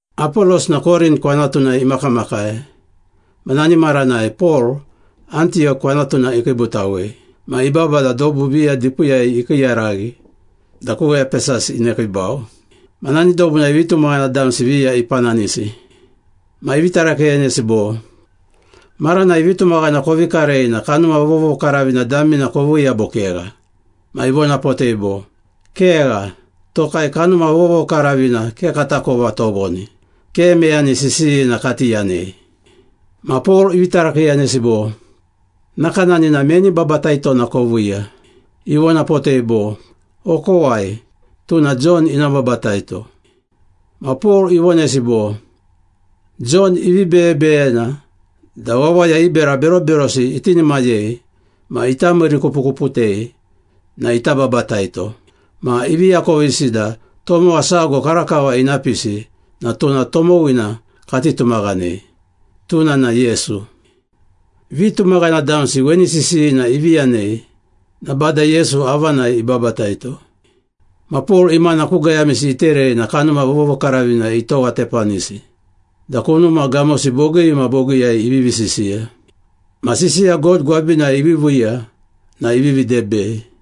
Apolos na Korint kwanatunai imakamakai ma nani maranai Pol, Antiyok kwanatuna ikiibutawei. Ma ibaba da dobu viya dipiiyai ikiiyaraghi da ku Epesas inekiibau. Ma nani dobunai vitumaghana damsi viya ipananisi. Ma ivi tarakiiyanesi bo, “Maranai vitumaghana kovi karei na Kanuma Vovokaravina damina koviiya bo kegha?” Ma ivonapotei bo, “Kegha. Tokai Kanuma Vovokaravina ke katakova tovoni. Ke meyani sisiyina kati yanei.” Ma Pol ivi tarakiiyanesi bo, “Nakanani na meni babataitona koviiya?” Ivonapotei bo, “Okowai, tuna Jon ina babataito.” Ma Pol ivonesi bo, “Jon ivi beyebeyena da wawaya i bera beroberosi itinimayei ma ita miirikupukuputei na ita babataito. Ma ivi akovisi da tomowa sago karakava ina pisi na tuna tomowina kati tumaghanei. Tuna na Yesu.” Vitumaghana damsi weni sisiyina ivi yanei na Bada Yesu avanai ibabataito. Ma Pol imana ku gayamisi iterei na Kanuma Vovokaravina itowatepanisi da kunuma gamosi bogii ma bogiiyai ivivi sisiya. Ma sisiya God gwabinai iviiviiya na ivivi debei.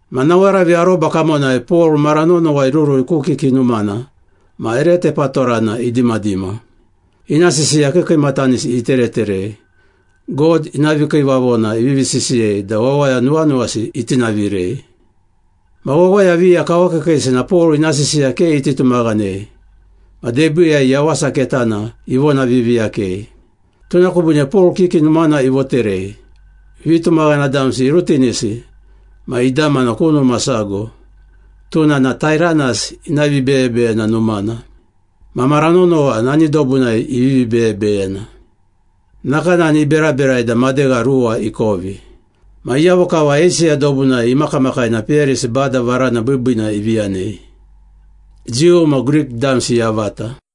Ma nawaravi aroba kamonai Pol mara nonowa irurui ku kiki numana ma ere tepatorana idimadima. Ina sisiya kiikiimatanisi itereterei, God ina vikiivavona ivivi sisiyei da wawaya nuwanuwasi itinavirei. Ma wawaya viya kawakiikiisi na Pol ina sisiya ke iti tumaghanei ma debiiyai Yawasa Ketana ivonaviiviiyakei. Tuna kubiine Pol kiki numana ivoterei, vitumaghana damsi irutinisi ma idamana ku numa sago, tuna na Tairanas ina vibeyebeyena numana. Ma mara nonowa nani dobunai ivivi beyebeyena. Nakanani iberaberai da madegha ruwa ikovi. Ma iyavo kava Eisiya dobunai imakamakai na peyarisi Bada varana biibiina ivi yanei, Jiu ma Grik damsi yavata.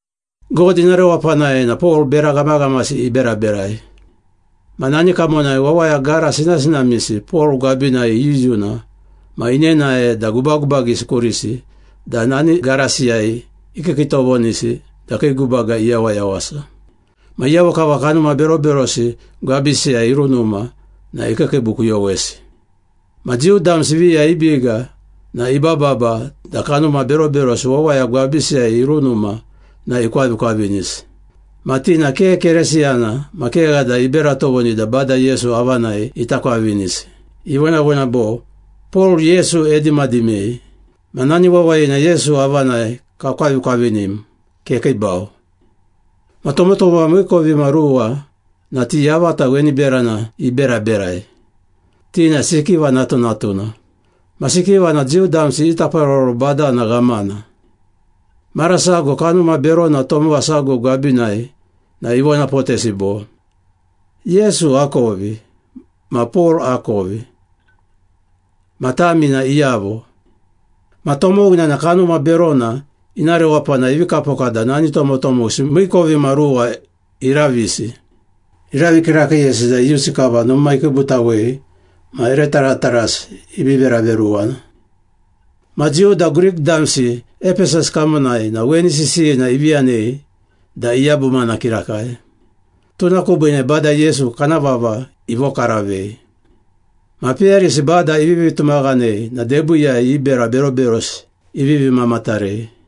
God ina rewapanai na Pol bera ghamaghamasi iberaberai. Ma nani kamonai wawaya gara sinasinamisi Pol gwabinai iyuyuna ma inenae da gubagubagisi kurisi da nani garasiyai ikiikiitovonisi da kii gubaga iyawayawasa. Ma iyavo kava kanuma beroberosi gwabisiyai irunuma na ikiikiibukuyowesi. Ma Jiu damsi viya i biga na ibababa da kanuma beroberosi wawaya gwabisiyai irunuma na ikwavikwavinisi. Ma ti na ke Keresiyana ma kegha da ibera tovoni da Bada Yesu avanai ita kwavinisi. Ivonavona bo, “Pol, Yesu edimadimei. Ma nani wawayina Yesu avanai kakwavikwavinim. Kekiibau!” Ma tomotomowa miikovimaruwa na ti yavata weni berana iberaberai. Ti na Sikiva natunatuna. Ma Sikiva na Jiu damsi i taparoro badana ghamana. Mara sago kanuma berona tomowa sago gwabinai na ivonapotesi bo, “Yesu akovi ma Pol akovi, ma tami na iyavo?” Ma tomowina na kanuma berona ina rewapanai ivi kapoka da nani tomotomowisi miikovimaruwa iravisi. Iravi kirakiiyesi da iyusi kava numa ikiibutawei ma ere taratarasi ivi veraveruwana. Ma Jiu da Grik damsi Epesas kamonai na weni sisiyina ivi yanei da iyabumana kirakai. Tuna kubiine Bada Yesu kana vava ivokaravei. Ma peyarisi Bada ivivi tumaghanei na debiiyai i bera beroberosi ivivi mamatarei.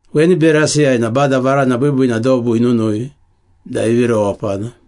Weni berasiyai na Bada varana biibiina dobu inunui da ivi rewapana.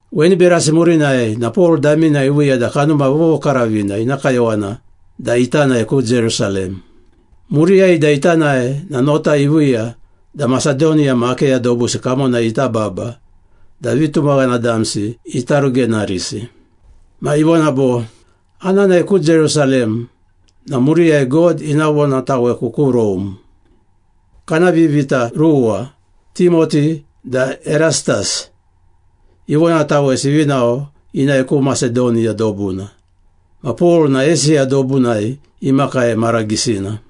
Weni berasi murinai na Pol damina iviiya da Kanuma Vovokaravina ina kayowana da ita nae ku Jerusalem. Muriyai da ita nae na nota iviiya da Masedoniya ma Akeya dobusi kamonai ita baba da vitumaghana damsi ita rugenarisi. Ma ivona bo, “Ana nae ku Jerusalem na muriyai God ina vonataweku ku Rome.” Kana vivita ruwa, Timoti da Erastas, ivonatawesi ivi nao inae ku Masedoniya dobuna. Ma Pol na Eisiya dobunai imakai mara gisina.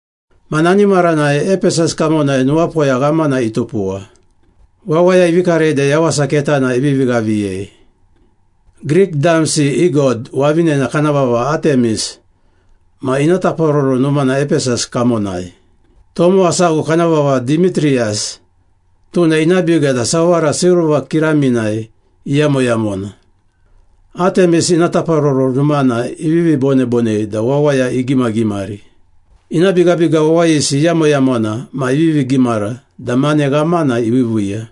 Ma nani maranai Epesas kamonai nuwapoya ghamana itupuwa. Wawaya ivi karei da Yawasa Ketana ivivi ghaviyei. Grik damsi i god wavinena kana vava Atemis ma ina taparoro numana Epesas kamonai. Tomowa sago kana vava Dimitriyas, tuna ina biga da sawara silva kiraminai iyamoyamona, Atemis ina taparoro numana ivivi bonebonei da wawaya igimagimari. Ina bigabiga wawayisi iyamoyamona ma ivivi gimara da mane ghamana iviiviiya.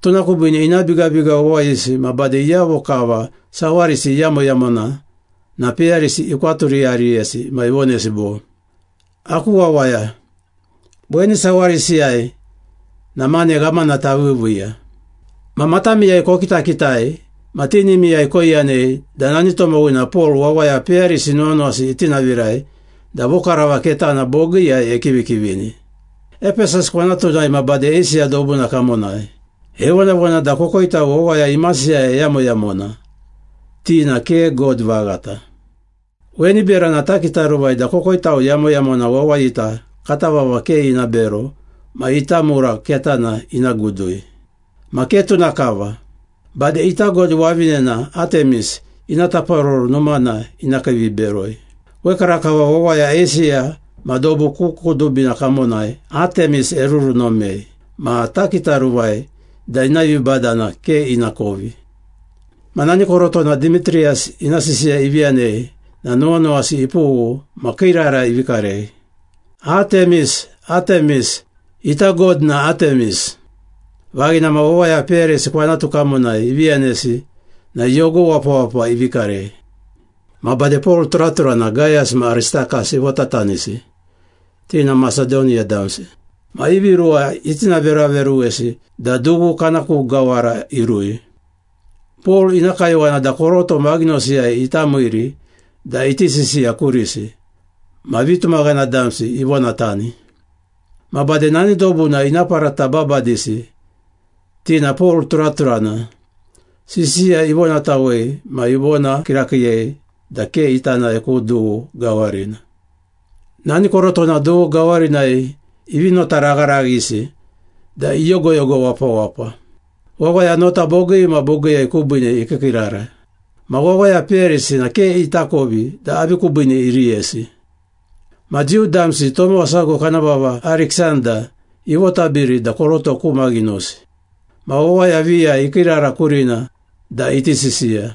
Tuna kubiine ina bigabiga wawayisi ma bade iyavo kava sawarisi iyamoyamona na peyarisi ikwaturiyariyesi ma ivonesi bo, “Aku wawaya, weni sawarisiyai na mane ghamana taviiviiya. Ma matamiyai kokitakitai ma tinimiyai koiyanei da nani tomowina Pol wawaya peyarisi nuwanuwasi itinavirai da vokavara ketana bogiiyai ekivikivini, Epesas kwanatunai ma bade Eisiya dobuna kamonai. Evonavona da kokoitau wawaya imasiyai eyamoyamona, ti na ke god vaghata. Weni berana takitaruvai da kokoitau yamoyamona wawayita kata vava ke ina bero ma ita mura ketana ina gudui. Ma ke tuna kava. Bade ita god wavinena Atemis ina taparoro numana ina kiiviberoi. Wekarakava wawaya Eisiya ma dobu ku kudubina kamonai Atemis erurunomei ma takitaruvai da ina vibadana ke ina kovi.” Ma nani korotona Dimitriyas ina sisiya ivi yanei na nuwanuwasi ipughu ma kiirara ivi karei, “Atemis! Atemis! Ita god na Atemis!” Vaghina ma wawaya peyarisi kwanatu kamonai ivi yanesi na yogo wapawapa ivi karei. Ma bade Pol turaturana Gayas ma Aristakas ivotatanisi, ti na Masedoniya damsi. Ma ivi ruwa itinaveraveruwesi da dughu kana ku gawara irui. Pol ina kayowana da koroto maghinosiyai ita miiri da iti sisiya kurisi, ma vitumaghana damsi ivonatani. Ma bade nani dobuna ina parata babadisi, ti na Pol turaturana, sisiya ivonatawei ma ivona kirakiiyei da ke ita nae ku dughu gawarina. Nani korotona dughu gawarinai ivi notaragharaghisi da iyogoyogo wapawapa. Wawaya nota bogii ma bogiiyai kubiine ikiikiirara. Ma wawaya peyarisi na ke itakovi da avi kubiine iriyesi. Ma Jiu damsi tomowa sago kana vava Ariksanda ivotabiri da koroto ku maghinosi. Ma wawaya viya ikiirara kurina da iti sisiya.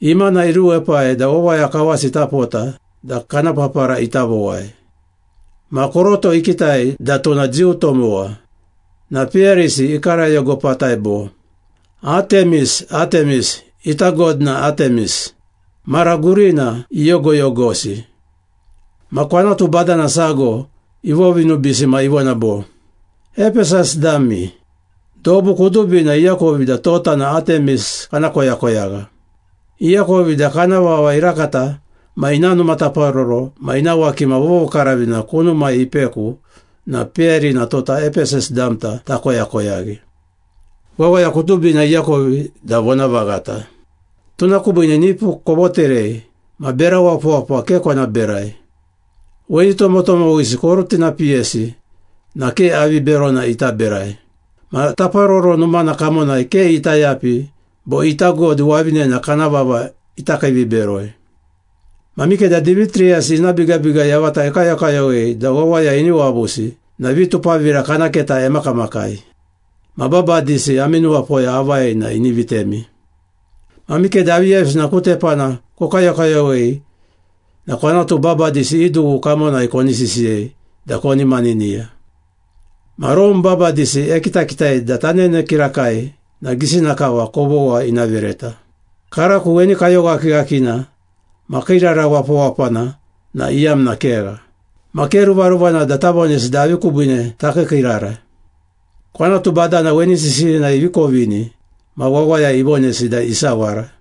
Imana iruepai da wawaya kawasi ita pota da kana papara ita vowai. Ma koroto ikitai da tuna Jiu tomowa, na peyarisi ikarayogopatai bo, “Atemis! Atemis! Ita god na Atemis!” Mara gurina iyogoyogosi. Ma kwanatu badana sago ivovinubiisi ma ivona bo, “Epesas dami! Dobu kudubina iakovi da tota na Atemis kana koyakoyagha. Iakovi da kana vava irakata ma ina numa taparoro ma ina wakima vovokaravina kunumai ipeku na peyarina tota Epesas damta takoyakoyaghi. Wawaya kudubina iakovi da vonavaghata. Tuna kubiine nipu kovoterei ma bera wapawapa ke kona berai. Weni tomotomowisi korutinapiyesi na ke avi berona ita berai. Ma taparoro numana kamonai ke ita yapi bo ita god wavinena kana vava ita kiiviberoi. Ma mikeda Dimitriyas ina bigabiga yavata ekayokayowei da wawaya ini wavusi na vitupavira kana keta emakamakai. Ma babadisi ami nuwapoya avai na ini vitemi. Ma mikeda aviyavisina ku tepana kokayokayowei na kwanatu babadisi i dughu kamonai koni sisiyei da koni maniniya. Ma Rome babadisi ekitakitai da tanene kirakai na gisina kava kovogha ina vereta. Karako weni kayoghakighakina ma kiirara wapawapana na iyamna kegha. Ma ke ruvaruvana da tavonesi da avi kubiine takiikiirara.” Kwanatu badana weni sisiyina ivi kovini ma wawaya ivonesi da isawara.